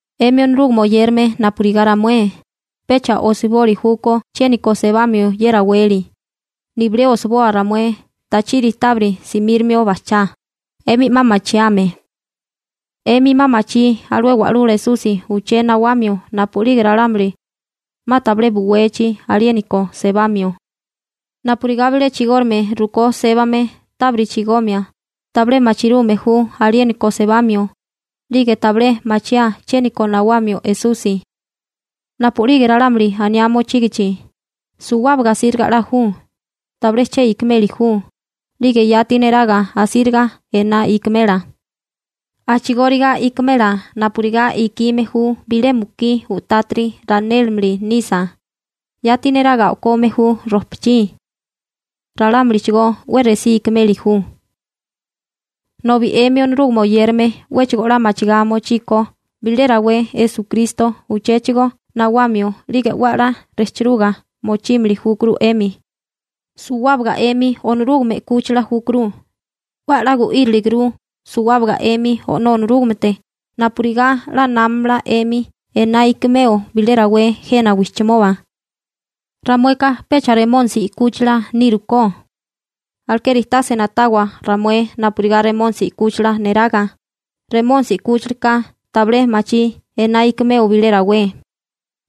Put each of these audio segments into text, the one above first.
'Emi Onorúgame oyérame napurigá ramué, pecha osiboli júkó chiéniko sebamio ye raweli, nibilé osiboa ramué tachiri tábiri simírimio bajchá, 'emi 'ma machiame. 'Emi 'ma machí alué Wa'lula Esusi uché nawamio napu'lige ralámuli 'ma tabilé buwechi aliéniko sebamio. Napurigá bilé chigórigame rukó sébame tábiri chigomia, tabilé machirume ju aliéniko sebamio, 'lige tabilé machiáa chiéniko nawamio Esusi. Napu'lige ralámuli aniá mochígichi: «Suwábaga asíriga 'la ju, tabilé che ikimeli ju», 'lige yati neraga asíriga ená ikimela. A'chigóriga ikimela napurigá ikime ju bilé mukí u'tátiri ranélimili nisa, yati neraga o'kome ju rojpachí. Ralámulichigó 'we resí ikimeli ju. Nobi 'emi Onorúgame oyérame 'wéchigo 'la machigá mochíkó bilé rawé Esukristo uchéchigo nawamio 'lige 'we 'la rejchiruga mochímili júkuru 'emi. Suwábaga 'emi Onorúgame 'kúchila júkuru, 'we a'lá gu'íriliguru suwábaga 'emi O'nó Onorúgamete napurigá 'la námamala 'emi ená ikimeo bilé rawé jena wijchimoba. Ramueka pecha Remónisi 'kúchila nírukó. Alekeri tase na'tawa ramué napurigá Remónisi 'kúchila neraga, Remónisi 'kúchilaka tabilé machí ená ikimeo bilé rawé.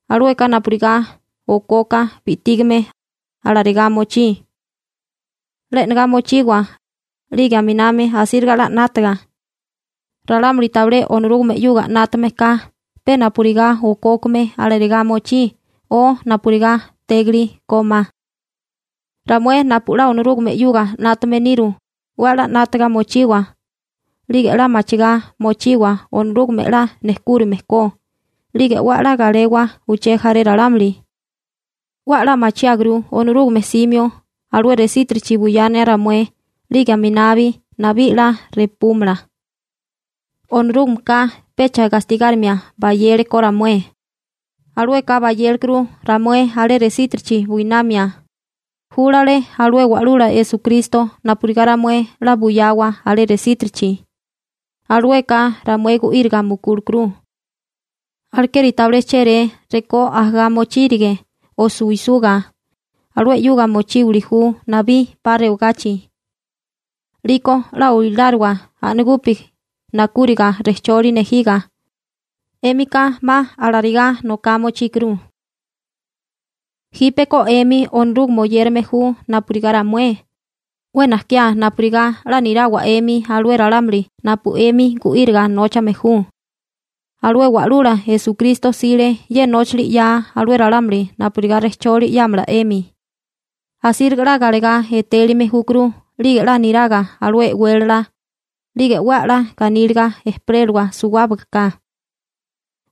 Alueka napurigá okoka bi'tígame, alarigá mochí. 'La e'negá mochiwa, 'lige aminami asíriga 'la 'nátaga. Ralámuli tabilé Onorúgame 'yuga 'nátame ka pe napurigá okókame alarigá mochí o napurigá tégili kómá. Ramué napu 'la Onorúgame 'yuga 'nátame niru, 'we a'lá 'nátaga mochiwa, 'lige 'la machigá mochiwa Onorúgame 'la nejkúrime ko, 'lige 'we a'lá galewa uché jaré ralámuli. 'We a'lá machiáguru Onorúgame 'simio alué resítirichi buyana ramué 'lige aminabi nabí 'la repúmala. Onorúgameka pecha gastigárimia bayele ko ramué. Alueka bayélekuru ramué alé resítirichi buinamia. Júlale alué Wa'lula Esukristo napurigá ramué 'la buyawa alé resítirichi. Alueka ramué gu'íriga mukúlekuru. Alekeri tabilé chéré rekó ajagá mochírige o suwisuga, alué 'yuga mochíwili ju nabí 'pa rewagachi. 'Liko 'la oiláriwa a'nagupi nakúriga rejcholi nejiga. 'Émika 'ma alarigá noká mochíkuru. Jípeko 'emi Onorúgame oyérame ju napurigá ramué, 'we najkiá napurigá 'la nirawa 'emi alué ralámuli napu 'emi gu'íriga nóchame ju. Alué Wa'lula Esukristo 'sile ye nóchili 'yaa alué ralámuli napurigá rejcholi 'yámala 'emi. Asíriga 'la galegá etélime júkuru 'lige 'la niraga alué e'wélala, 'lige 'we a'lá ganíliga ejperélawa suwábaga ka.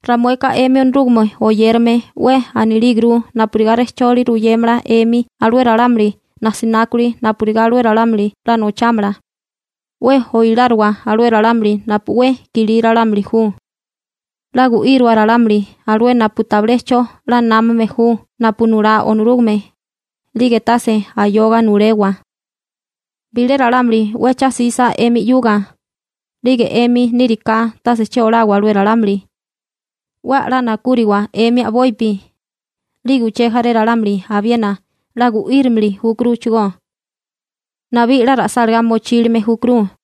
Ramueka 'emi Onorúgame oyérame 'we anilíguru napurigá rejcholi ruyémala 'emi alué ralámuli nasinákuli napurigá alué ralámuli 'la nochámala. 'We oiláriwa alué ralámuli napu 'we kilí ralámuli ju. 'La gu'íriwa ralámuli alué napu tabilé 'cho 'la námame ju napu nulá Onorúgame, 'lige tase ayoga nulewa. Bilé ralámuli 'we cha 'sisa 'emi 'yuga, 'lige 'emi níriká tase che olawa alué ralámuli. 'We a'lá nakúriwa 'emi a'bopi, 'lige uché jaré ralámuli abiena 'la gu'írimili júkuruchigó. Nabí 'la ra'sálagá mochílime júkuru.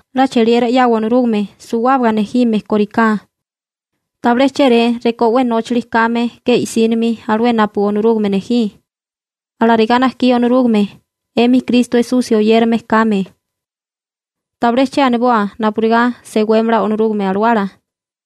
'La cheliera 'yawa Onorúgame suwábaga nejime koriká, tabilé chéré rekó 'we nóchali kame ke i'sínimi alué napu Onorúgame nejí. Alarigá najkí Onorúgame, 'emi Kristo Esusi oyérame kame. Tabilé che aniboa napurigá sewémala Onorúgame Alawala.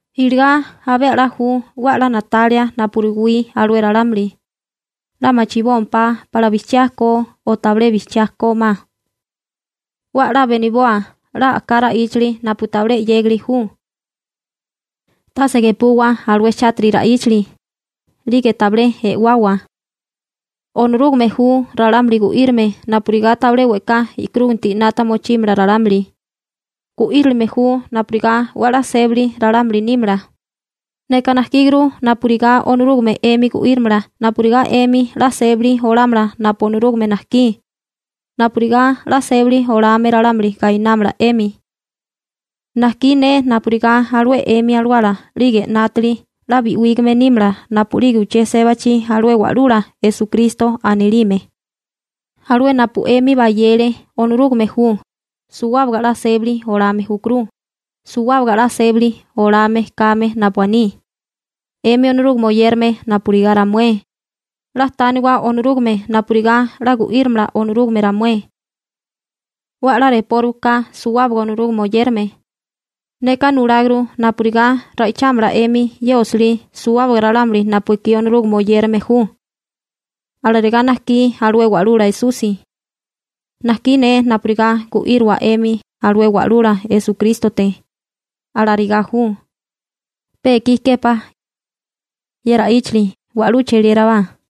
Iligá abé 'la ju 'we a'lá na'talia napu ruwí alué ralámuli, 'la machibómpá pala bijchiá ko o tabilé bijchiá kómá. 'We a'lá beniboa 'la a'ká ra'íchali napu tabilé 'yégali ju. Tase gepuwa alué chátiri ra'íchali, 'lige tabilé e'wawa. Onorúgame ju ralámuli gu'írame napurigá tabilé we'ká e'karúginti 'nata mochímala ralámuli. Gu'írilime ju napurigá 'we a'lá sébili ralámuli nímala. Neka najkíguru napurigá Onorúgame 'emi gu'írimala napurigá 'emi 'la sébali olámala napu Onorúgame najkí, napurigá 'la sébali olame ralámuli gainámala 'emi. Najkí ne napurigá alué 'emi alawala 'lige 'nátili 'la bi'wígame nímala napu'lige uché sébachi alué Wa'lula Esukristo anilime. Alué napu 'emi bayele Onorúgame ju, suwábaga 'la sébali olame júkuru, suwábaga 'la sébali olame kame napu aní. 'Emi Onorúgame oyérame napurigá ramué, 'la tániwa Onorúgame napurigá 'la gu'írimala Onorúgame ramué. 'We 'la repóriwa ka suwábaga Onorúgame oyérame. Neka nuláguru napurigá ra'ichámala (leéramala) 'emi ye osilí suwábaga ralámuli napu ekí Onorúgame oyérame ju. Alarigá najkí alué Wa'lula Esusi. Najkí ne napurigá gu'írua 'emi alué Wa'lula Esukrístote. Alarigá ju. Pe ikí képá ye ra'íchali. Wa'lú cheliérabá.